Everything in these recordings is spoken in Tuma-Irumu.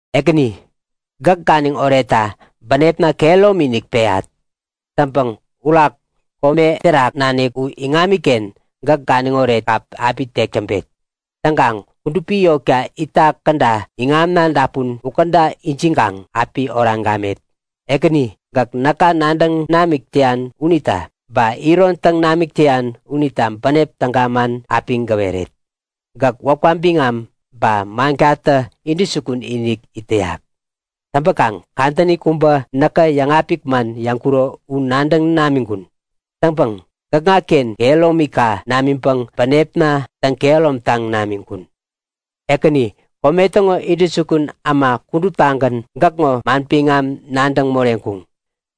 Ekäni, gäk ganiŋ oretta bänepna kehäromi-inik peyat. Täŋpäŋ urak kome terak nanik u iŋamiken gäk ganiŋoret kap api tek täŋpet. Täŋkaŋ kudupi yotka itak käda iŋamna dapun ukäda ijiŋkaŋ api oraŋ gamet. Ekäni, gäk näka nadäŋ namik täyan unita, ba iron täŋ namik täyan unita bänep täga man api gäweret. Gäk wäpka biŋam ba mankatä intäjukun-inik it täyak. Täŋpäkaŋ kadäni kubä näkä yäŋapik man yäŋkuro u nadäŋ namiŋkun. Täŋpäŋ gäkŋaken kehäromika namiŋpäŋ bänepna täŋ-kehäromtaŋ namiŋkun. Ekäni, kome täŋo intäjukun äma kuduptagän gäkŋo manbiŋam nadäŋ moreŋkuŋ.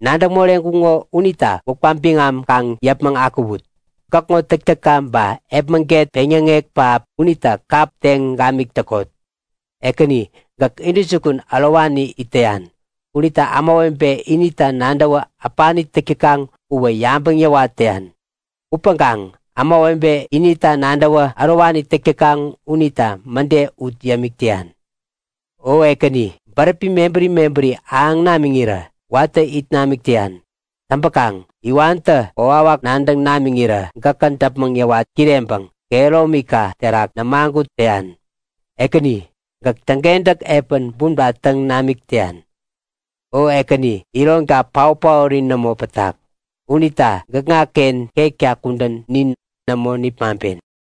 Nadäŋ moreŋkuŋo unita wäpka biŋam kaŋ yäpmäŋ akuwut! Gäkŋo täktäkka ba epmäget peŋyäŋek pähap unita kap teŋ gamik täkot. Ekäni gäk intäjukun ärowani it täyan unita ämawebe inita nadäwä äpani täk täkaŋ uwä yabäŋ yäwat täyan. Upäŋkaŋ ämawebe inita nadäwä ärowani täk täkaŋ unita mäde ut yämik täyan. O Ekäni, bäräpi mebäri mebäri ahäŋ namiŋirä watä it namik täyan. Täŋpäkaŋ iwantä kokwawak nadäŋ namiŋirä gäkä däpmäŋ yäwat kireŋpäŋ kehäromika terak nämagut täyan. Ekäni, gäk täŋkentäk epän bumta täŋ namik täyan. O Ekäni, ironka paot-paori nämo pätak. Unita gäkŋaken ketka kudän nin nämo nipmaŋpen.